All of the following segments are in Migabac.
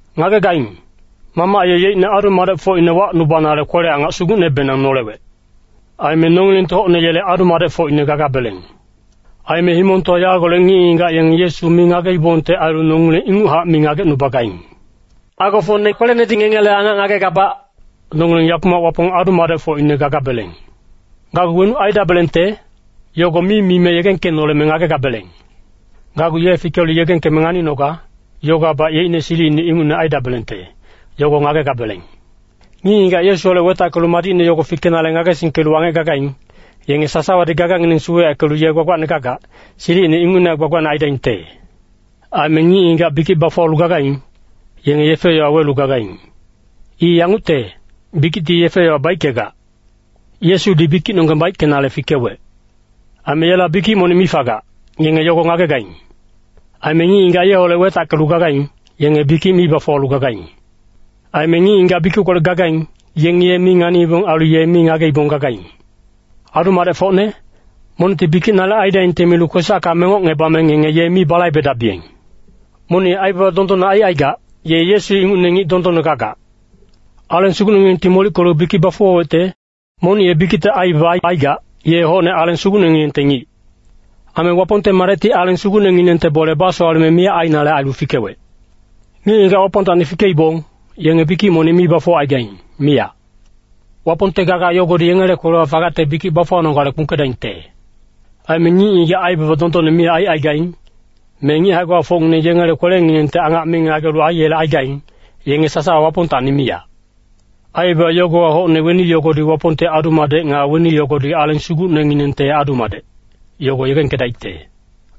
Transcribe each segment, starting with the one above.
Ngagegaing, Mamac ye yeicne adu-madecfocine wacnubanale kwele-angac sugucnebenang nolewec. Aime nongilengti hocne yele adu-madecfocine gagabeleng. Aime himongtowa yagolec ngic-ngigac yenge Yesu mi ngageibongte ailu nongileng inguchac mi ngagecnubagaing. Agofocne kwelenedi ngengele angac ngagegabac, nongileng yakumac Wapong adu-madecfocine gagabeleng. Gacgu wenuc aidabelengte, yogo mi mime yegengkenoleme ngagegabeleng. Gacgu ye fikelu yegengkeme nganinoga, yogowabac yeicne silic ingucne aidabelengte, yogo ngagegabeleng. Ngic-ngigac Yesuholec wetackelu madicne yogo fikenale ngagesingkelu wangec gagaing, yenge sasawadi gagangineng suweyackelu ye gbagbacne gagac, silicine ingucnehac gbagbacne aidaingte. Aime ngic-ngigac bikic bafuwalu gagaing, yenge yefe-yowa welu gagaing. I yangucte, bikicti yefe-yowa baickegac. Yesudi bikicnonggeng baickenale fikewec. Aime yela bikic monic mi fagac, ngenge yogo ngagegaing. Aime ngic-ngigac yeholec wetackelu gagaing, yenge bikic mi bafuwalu gagaing. Aime ngic-ngigac bikickolec gagaing, yengi ye mi nganiibong ailu ye mi ngageibong gagaing. Adu-madecfocne, monicti bikic nalic aidaingte milu kwesacka mengocngebame ngenge ye mi balaibedabiyeng. Monic ye aibaba dondonne aicaigac, ye Yesu ingucne ngic dondonne gagac. Aleng Sugucnenginengti molickelu bikic bafuwawecte, monic ye bikicte aibaba aicaigac, ye hocne Aleng Sugucnenginengte ngic. Aime Wapongte Madecti Aleng Sugucnenginengte bole basowaleme miyac ainale ailu fikewec. Ngic-ngigac Wapongtacni fikeibong, yenge bikic monic mi bafuwacaigaing, miyac. Wapongte gaga yogodi yengele kwelewa fagacte bikic bafuwanogale kpungkedaingte. Aime ngic-ngigac aibaba dondonne mi aicaigaing, me ngic hae-gbafocngineng yengele kwelenginengti angac mi ngagelu aiyelecaigaing, yenge sasawa Wapongtacni miyac. Aibaba yogowa hocne weni yogodi Wapongte adu-madec nga weni yogodi Aleng Sugucnenginengte adu-madec, yogo yegengkedaicte.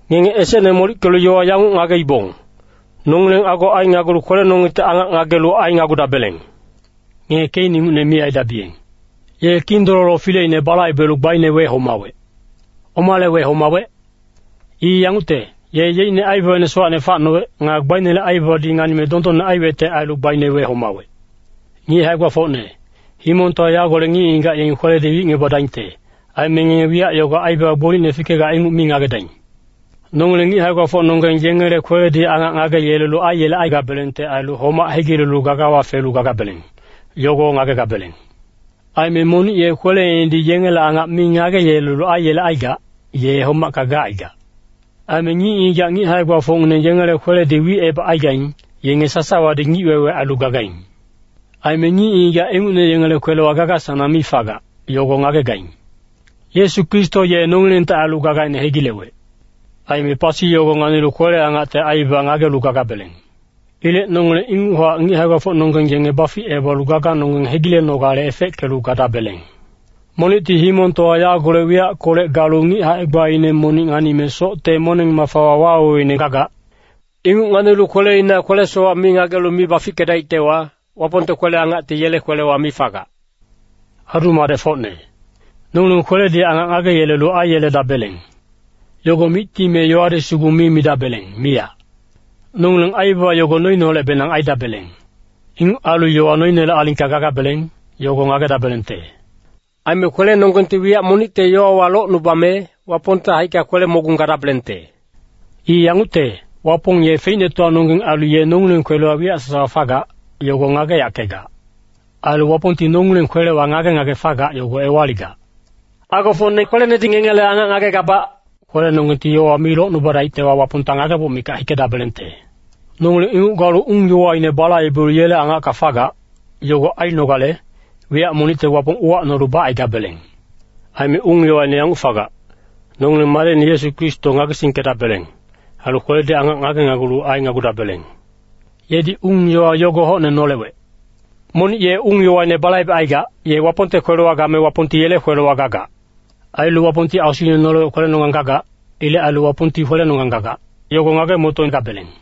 Ngenge esecne molickelu yowa yanguc ngageibong, nongileng ago ainagulu kwelenonggengti angac ngagelu ainagudabeleng. Ngenge Kein ingucne mi aidabiyeng. Ye Kindololo fileine balaibelu gbaine wehomawec. Omale wehomawec? I yangucte, ye yeicne aibabaine sowacne facnowec. Nga gbainele aibabadi nganime dondonne aiwecte ailu gbaine wehomawec. Ngic hae-gbafocne, himongtowa yagolec ngic-ngigac yengi kweledi wicngebadaingte. Aime ngenge wiyac yogo aibaba gbolicne fikegac inguc mi ngagedaing. Nongileng ngic hae-gbafocnonggeng yengele kweledi angac ngageyelelu aiyelecaigabelengte ailu homac hegilelu gagawa felu gagabeleng, yogo ngagegabeleng. Aime monic ye kweleinedi yengele angac mi ngageyelelu aiyelecaigac, ye homacka gacaigac. Aime ngic-ngigac ngic hae-gbafocngineng yengele kweledi wicebacaigaing, yenge sasawadi ngic-wewe ailu gagaing. Aime ngic-ngigac ingucne yengele kwelewa gaga-sanang mi fagac, yogo ngagegaing. Yesu Kristo ye nongilengte ailu gagaine hegilewec. Aime pasi yogo nganilu kwele-angacte aibaba ngagelu gagabeleng. Ilec nongileng inguchac ngic hae-gbafocnonggeng yenge baficebalu gaganonggeng hegilenogale efeckelu gadabeleng. Monicti himongtowa yagolec wiyackolec galu ngic hae-gbaine monic nganime socte moneng-mafawa waweweine gagac. Inguc nganilu kweleina kwele-sowac mi ngagelu mi bafickedaictewa, Wapongte kwele-angacti yele kwelewa mi fagac. Adu-madecfocne, “Nongileng kweledi angac ngageyelelu aiyeledabeleng.” Yogo micti me yowadi sugu mi midabeleng, miyac. Nongileng aibaba yogo noineholecbenang aidabeleng. Inguc ailu yowa noinele alingka gagabeleng, yogo ngagedabelengte. Aime kwelenonggengti wiyac monicte yowawa locnubame, Wapongte haicka kwele-mogung gadabelengte. I yangucte, Wapong ye feicnetowanonggeng ailu ye nongileng kwelewa wiyac sasawa fagac, yogo ngageyackegac. Ailu Wapongti nongileng kwelewa ngage-ngage fagac yogo ewaligac. Agofocne kwelenedi ngengele angac ngagegabac, kwelenonggengti yowawa mi locnubadaictewa, Wapongta ngageboc mikac hikedabelengte. Nongileng inguc galu ung-yowaine balaibelu yele angacka fagac, yogo ainogale, wiyac monicte Wapong uwacnolu bacaigabeleng. Aime ung-yowaine yanguc fagac, nongileng Madecine Yesu Kristo ngagesingkedabeleng. Ailu kweledi angac ngagenagulu ainagudabeleng. Yedi ung-yowa yogo hocne nolewec. Monic ye ung-yowaine balaibecaigac, ye Wapongte kwelewa game Wapongti yele kwelewa gagac. Ailu Wapongti Asuine nolewec kwelenonggang gagac. Ilec ailu Wapongti kwelenonggang gagac, yogo ngage-motogabeleng.